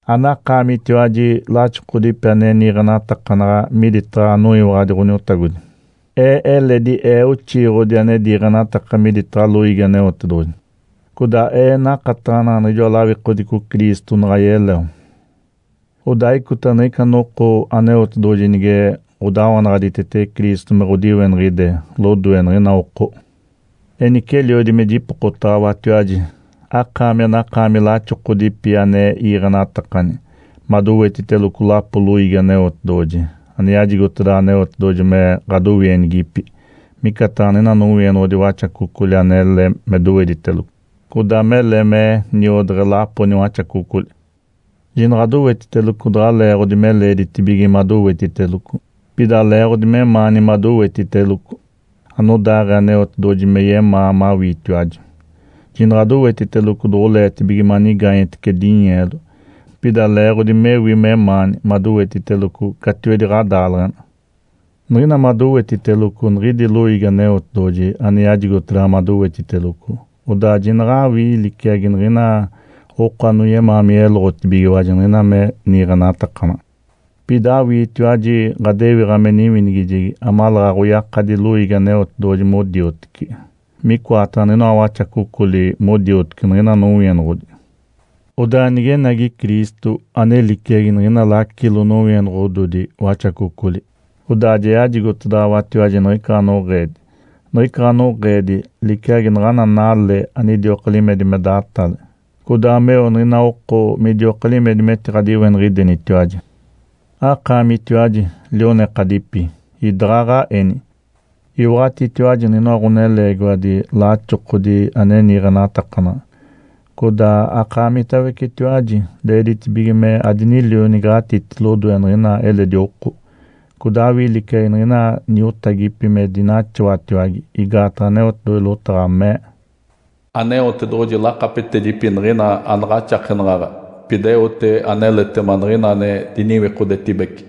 Anakaamitiwaji laxokodipi ane niiɡ̶enatakanaɡ̶a miditaɡ̶a anoyiwaɡ̶adi Ǥoniotagodi. Ee eledi ee oxiiɡ̶odi ane diiɡ̶enataka miditaɡ̶a loiigi Aneotedoɡ̶oji. Codaa ee nakataɡ̶anaɡ̶a niɡ̶ijoa lawikodico Cristo naɡ̶a yeleo. Odaa icota niɡ̶ica noko Aneotedoɡ̶oji nige ɡ̶odawanaɡ̶aditetege Cristo me ɡ̶odiweniɡ̶ide lodoe niɡ̶ina oko. Enice eliodi me jipokotaɡ̶awatiwaji, akaami anakaami laxokodipi ane iiɡ̶enatakani, madowetiteloco lapo loiigi Aneotedoɡ̶oji, ane yajigotedaɡ̶awa Aneotedoɡ̶oji me ɡ̶adowienigipi, micataɡ̶a niɡ̶ina nowienoɡ̶odi waxacocoli anele me doweditelogo codaa mele me niodeɡ̶e lapo niwaxacocoli. Jinaɡ̶adowetiteloco daɡ̶a leeɡ̶odi me leeditibige madowetiteloco, pida leeɡ̶odi memaani madowetiteloco, anodaaɡ̶ee Aneotedoɡ̶oji me yemaa mawiitiwaji. Jinaɡ̶adowetiteloco doɡ̶oleetibige manigaanyetece dinyeelo, pida leeɡ̶odi mewi memaani madowetiteloco catiwedi ɡ̶adaaleɡ̶ena. Niɡ̶ina madowetiteloco niɡ̶idi loiigi Aneotedoɡ̶oji ane yajigotedaɡ̶awa madowetiteloco, odaa jinaɡ̶awii liciagi niɡ̶ina oko anoyemaa me yeloɡ̶otibigiwaji niɡ̶ina me niiɡ̶enatakanaɡ̶a, pida awiitiwaji ɡ̶adewiɡ̶a me niwinigijegi amaleeɡ̶aɡ̶a oyakadi loiigi Aneotedoɡ̶oji modioteci, micoataɡ̶a niɡ̶inoa waxacocoli modioteci niɡ̶ina nowienoɡ̶odi. Odaa nigenagi Cristo, ane liciagi niɡ̶ina lacilo nowienoɡ̶ododi waxacocoli, odaa ja yajigotedaɡ̶awatiwaji niɡ̶ica ɡ̶anoɡ̶eedi. Niɡ̶ica ɡ̶anoɡ̶eedi liciagi naɡ̶ana nale anidioka limedi me datale, codaa meo niɡ̶ina oko midioka limedi metiɡ̶adiweniɡ̶idenitiwaji. Akaamitiwaji, lionekadipi, idaɡ̶aɡ̶aeni. Iwaɡ̶atitiwaji niɡ̶inoa ɡ̶oneleegiwadi laxokodi ane niiɡ̶enatakanaɡ̶a. Codaa akaamitawecetiwaji leeditibige me adinilioniɡ̶atiti lodoe niɡ̶ina eledi oko, codaa awii liciagi niɡ̶ina niotagipi me dinaxawatiwage. Igaataɡ̶a Aneotedoɡ̶oji lotaɡ̶a mee, “Aneotedoɡ̶oji lakapetedipi niɡ̶ina anaɡ̶axakenaɡ̶aɡ̶a, pida eote aneletema niɡ̶ina ane diniwikodetibece.”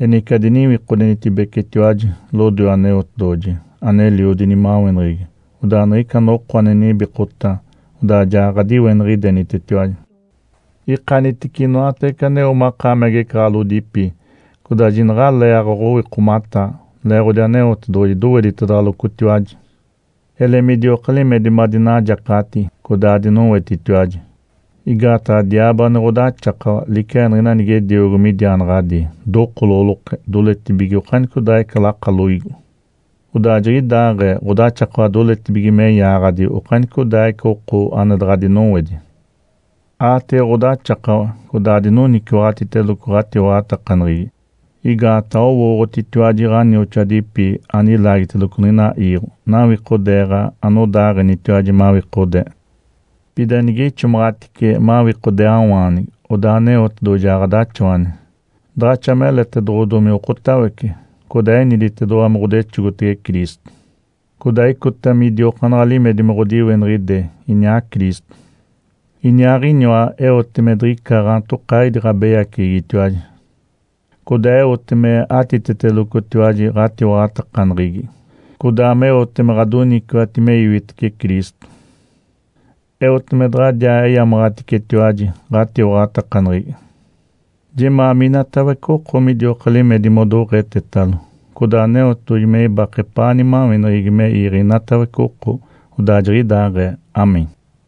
Enice adiniwikodenitibecetiwaji lodoe Aneotedoɡ̶oji aneliodi nimaweneɡ̶egi. Odaa niɡ̶ica noko ane nibikota, odaa ja ɡ̶adiweniɡ̶idenitetiwaji. Ikanitece inoatawece aneo makaami agecaɡ̶alodipi, codaa jinaɡ̶alee aɡ̶owikomataa, leeɡ̶odi Aneotedoɡ̶oji doweditedaɡ̶alocotiwaji. Ele midioka limedi madinajacaɡ̶ati, codaa adinowetitiwaji. Igaataɡ̶a diaabo ane ɡ̶odaxakawa liciagi niɡ̶ina nigediogo midiaanaɡ̶adii, dokoloɡ̶oloke, doletibige okanicodaaɡ̶ica lakaloigo. Odaa jiɡ̶idaaɡ̶ee ɡ̶odaxakawa doletibige me yaaɡ̶adi okanicodaaɡ̶ica oko ane daɡ̶a dinowedi. Aatege ɡ̶odaxakawa, codaa adinoniciwaɡ̶atiteloco ɡ̶atiwaɡ̶atakaneɡ̶egi. Igaataɡ̶a owooɡ̶otitiwaji ɡ̶anioxoadipi ane ilaagiteloco niɡ̶ina iiɡ̶o nawikodeeɡ̶a anodaaɡ̶enitiwaji mawikodee. Pida nige ixomaɡ̶atice mawikodeeawaanigi, odaa Aneotedoɡ̶oji ja ɡ̶adaxawani. Daɡ̶axa meletedoɡ̶odomi okotawece, codaa eniditedoɡ̶owa me ɡ̶odexogotege Cristo, codaa icota midiokaanaɡ̶a limedi me ɡ̶odiweniɡ̶ide iniaa Cristo. Iniaaɡ̶iniwa eote me diɡ̶icata gaantokaaɡ̶ini ɡ̶abeyaceɡ̶egitiwaji. Codaa eote me atitetelocotiwaji ɡ̶atiwaɡ̶atakaneɡ̶egi, codaa meote me ɡ̶adoniciwati me iwitece Cristo. Eote me daɡ̶adiaa eyamaɡ̶aticetiwaji ɡ̶atiwaɡ̶atakaneɡ̶egi. Jemaa minatawece oko midioka limedi modoɡ̶etetalo, codaa Aneotedoɡ̶oji me ibake epaa nimaweneɡ̶egi me iiɡ̶e inatawece oko. Odaa jiɡ̶idaaɡ̶ee. Amém.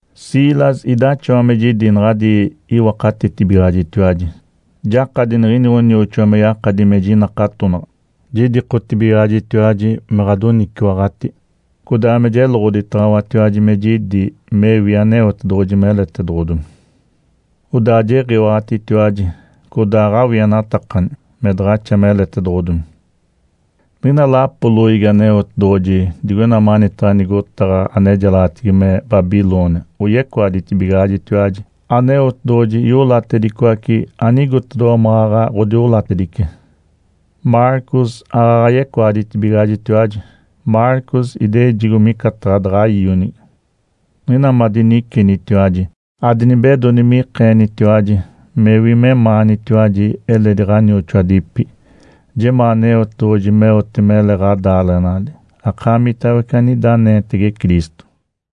Silas idaxawa me jidi naɡ̶adi iwakatetibigaɡ̶ajitiwaji. Jakadi niɡ̶ini ɡ̶onioxoa me yakadi me jinakatonaɡ̶a. Jidikotibigaɡ̶ajitiwaji me ɡ̶adoniciwaɡ̶ati, codaa me jeloɡ̶oditaɡ̶awatiwaji me jidi mewi Aneotedoɡ̶oji meletedoɡ̶odomi. Odaa jiɡ̶iwaɡ̶atitiwaji, codaa aɡ̶awienatakani me daɡ̶axa meletedoɡ̶odomi. Niɡ̶ina lapo loiigi Aneotedoɡ̶oji digoina manitaɡ̶a nigotaɡ̶a anejalaɡ̶atigi me “Babilônia” oyecoaditibigaɡ̶ajitiwaji. Aneotedoɡ̶oji iolatedicoace anigotedoɡ̶owa maɡ̶aɡ̶a ɡ̶odiolatedice. Marcos aaɡ̶aɡ̶a yecoaditibigaɡ̶ajitiwaji, Marcos idejigo micataɡ̶a daɡ̶a ionigi. Niɡ̶ina madinicenitiwaji, adinibedoni me ikeenitiwaji mewi memaanitiwaji eledi ɡ̶anioxoadipi. Jemaa Aneotedoɡ̶oji meote mele ɡ̶adaaleɡ̶enali, akaamitawece anida anenitege Cristo.